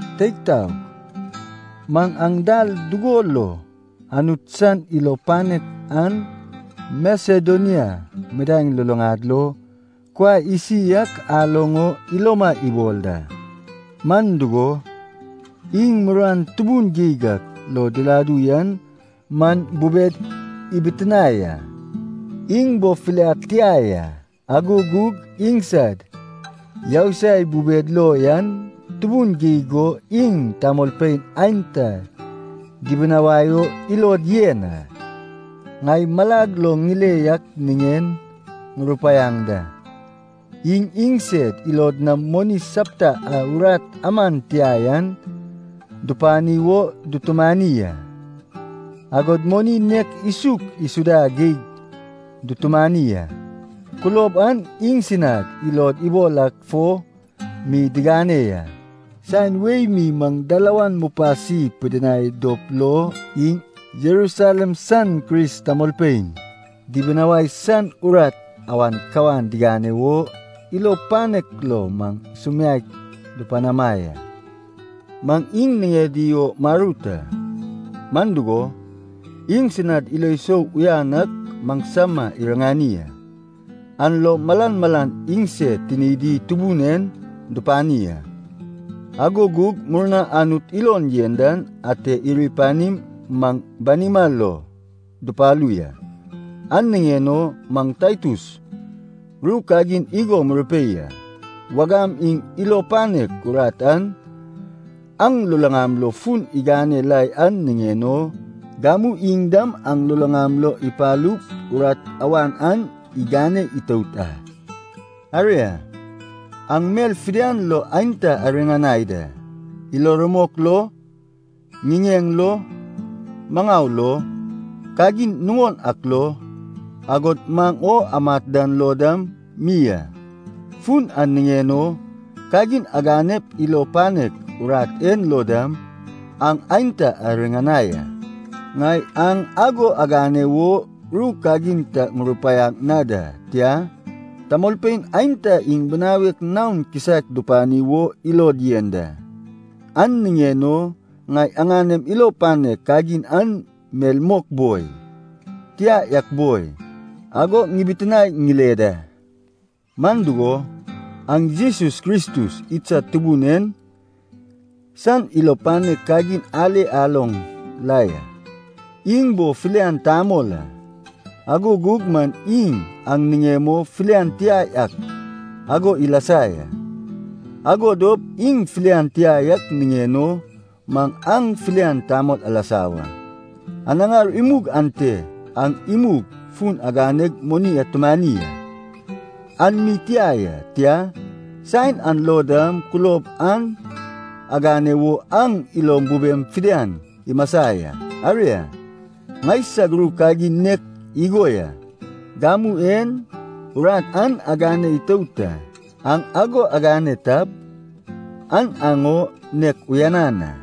Teig taog, maŋ aŋ dal dugo lo Anut san ilo panek an Masedonia midaeŋ luluŋad lo kuai isi ak aloŋ o iloma ibol da. Man dugo, iŋ muruan tubun geig ak lo diladu yan man bubed ibitinae a. Iŋ bo filiad tia ya, ago gug iŋsad yousai bubed lo yan tubun geig go iŋ tamolpein aenta dibinawai o ilod yen a. Ŋai malag lo ŋile yak niŋen ŋurupaiaŋ da, iŋ iŋsed ilod nam moni sapta a urat aman tia yan dupani wo dutumani a. Agod moni nen isuk isuda geig dutumani a. Kulob an iŋsinad ilod ibol ak fo mi digane ya. Saen wei mi maŋ dalawan mupasi pidinai dop lo, iŋ Jerusalem san Kris tamolpein dibinawai san urat awan ka digane wo, ilo panek lo maŋ sumiaek dupanama ya. Maŋ iŋ niŋedi wo marut a, man dugo, iŋsinad ilo sou uyanan ak maŋsama iriŋani a. An lo malan malan iŋsed tinidi Tubun en dupani a, ago gug murna Anut ilon yen dan ate iri panim maŋ banima lo dupalu ya. An niŋen o maŋ Taitus ru kagin igo murupei a. Wagam iŋ ilo panek urat an aŋ luluŋam lo fun igane la yan niŋen o, gamu iŋ dam aŋ luluŋam lo ipalup urat awan an igane itout a. Aria, aŋ mel fidian lo aenta ariŋanai da, ilo rumok lo, ŋiŋeŋ lo, maŋau lo, kagin nuŋon ak lo, agod maŋ o amat dan lo dam mi a. Fun an niŋen o kagin aganep ilo panek urat en lo dam aŋ aenta ariŋanai a. Ŋai aŋ ago agane wo ru kagin ta ŋupanaŋ na da, tia, tamolpein aenta iŋ binawek naon kisaek dupani wo ilod yen da, an niŋen o ŋai aŋanem ilo panek kagin an mel mok boi, tia yak boi, ago ŋibitinae ŋile da. Man dugo, aŋ Jesus Kristus idsad Tubun en san ilo panek kagin ale aloŋ la ya. Iŋ bo filian tamol a, ago gug man iŋ aŋ niŋem o filian tia yak ago ilasa ya. Ago dop iŋ filian tia yak niŋen o man aŋ filian tamolpein alasa wa. Anaŋar imug ante aŋ imug fun aganeg moni atumani a. An mi tia ya, tia, saen an lo dam kulob an agane wo aŋ ilom bubem fidian imasa ya. Aria, ŋaisag ru kagin nek igo ya, gamu en urat an agane itout a. Aŋ ago agane tap, an aŋ o nek uyanan a.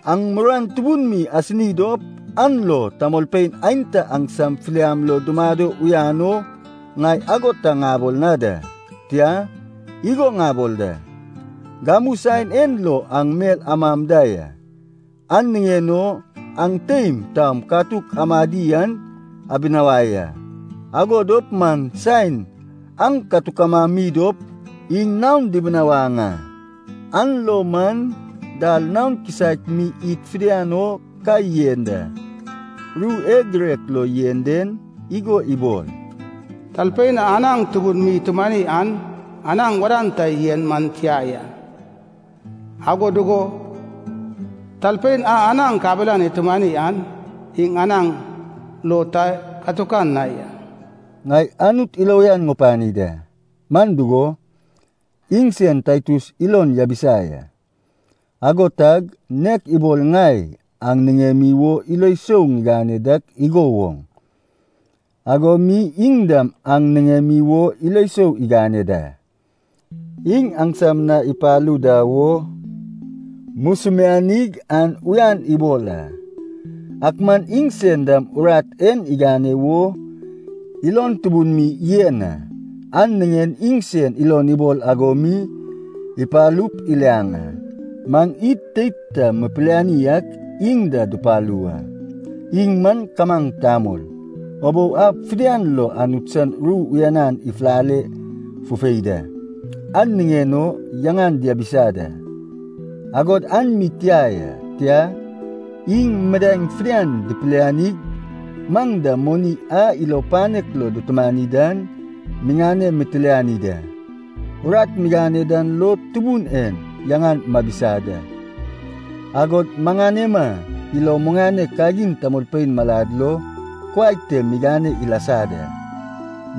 Aŋ muruan tubun mi asini dop an lo tamolpein aenta aŋsam filian lo dumado uyan o ŋai ago ta ŋabol na da. Tia, igo ŋabol da. Gamu saen en lo aŋ mel amam da ya, an niŋen o aŋ teim taom katuk amadi an abinawai a. Ago dop man saen aŋ katuk amami dop iŋ naon dibinawaŋ a. An lo man dal naon kisaek mi id fidian o ka yen da. Ru e girek lo yen den igo ibol, “Talpein a anaŋ tubun mi itumani an anaŋ wadan ta yen man tia ya, ago dugo talpein a anaŋ kabelan itumani an iŋ anaŋ lo ta katukan na ya.” Ŋai Anut ilo uyan ŋupani da, man dugo, iŋsen Taitus ilon yabisa ya. Ago tag, nek ibol ŋai aŋ niŋemi wo ilo sou ŋigane dak igo woŋ, ago mi iŋ dam aŋ niŋemi wo ilo sou igane da. Iŋ aŋsam na ipalu da wo musumianig an uyan ibol a. Ak man iŋsen dam urat en igane wo ilon tubun mi yen a, an niŋen iŋsen ilon ibol ago mi ipalup iliaŋ a. Maŋ id teid ta mipiliani ak iŋ da dupalu wa. Iŋ man kamaŋ tamol, ubou ab fidian lo Anut san ru uyanan ifulale fufei da, an niŋen o yaŋan diabisa da. Agod an mi tia ya. Tia, iŋ midaeŋ fidian dipilianig maŋ da moni a ilo panek lo dutumani dan miŋane mitiliani da. Urat migane dan lo Tubun en yaŋan mabisa da, agod maŋanema ilo muŋanek kagin tamolpein malad lo kuai te migane ilasa da.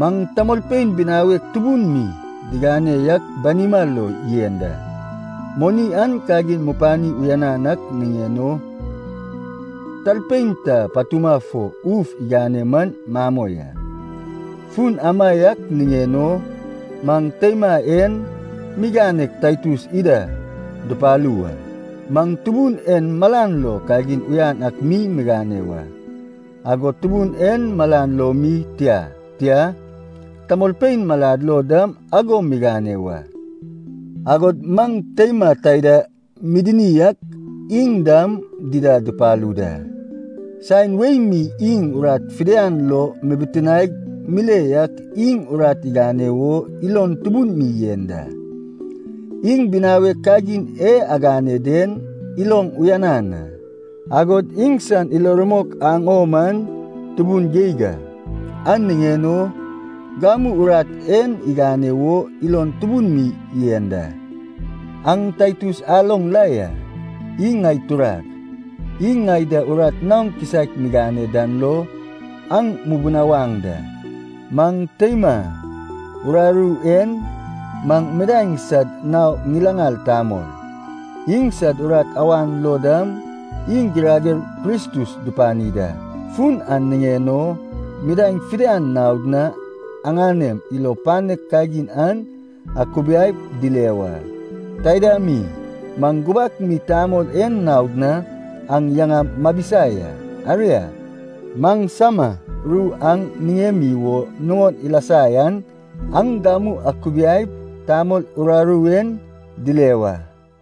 Maŋ tamolpein binawek tubun mi digane yak banima lo yen da. Moni an kagin mupani uyanan ak niŋen o talpein ta patuma fo uf igane man mamoi a. Fun amaiak niŋen o maŋ teima en miganeg Taitus ida dupalu wa. Maŋ Tubun en malan lo kagin uyan ak mi migane wa, agod Tubun en malan lo mi tia. Tia, tamolpein malad lo dam ago migane wa. Agod maŋ teima taida midini ak iŋ dam dida dupalu da. Saen wei mi iŋ urat fidian lo mibitinaeg mile yak iŋ urat igane wo ilon tubun mi yen da. Iŋ binawek kagin e agane den iloŋ uyanan a, agod iŋsan ilo rumok aŋ o man tubun geig a. An niŋen o gamu urat en igane wo ilon tubun mi yen da. Aŋ Taitus aloŋ la ya, iŋ ŋai turag, iŋ ŋai da urat naon kisaek migane dan lo aŋ mubunawaŋ da. Maŋ teima uraru en man midaeŋ sad nao ŋilaŋal tamol, iŋsad urat awan lo dam iŋ girager Kristus dupani da. Fun an niŋen o midaeŋ fidian naod na aŋanem ilo panek kagin an akubiaip dile wa. Taida mi, maŋ gubak mi tamol en naod na aŋ yaŋam mabisa ya. Aria, maŋsama ru aŋ niŋemi wo nuŋon ilasa yan aŋ gamu akubiaip tamol uraru en dile wa.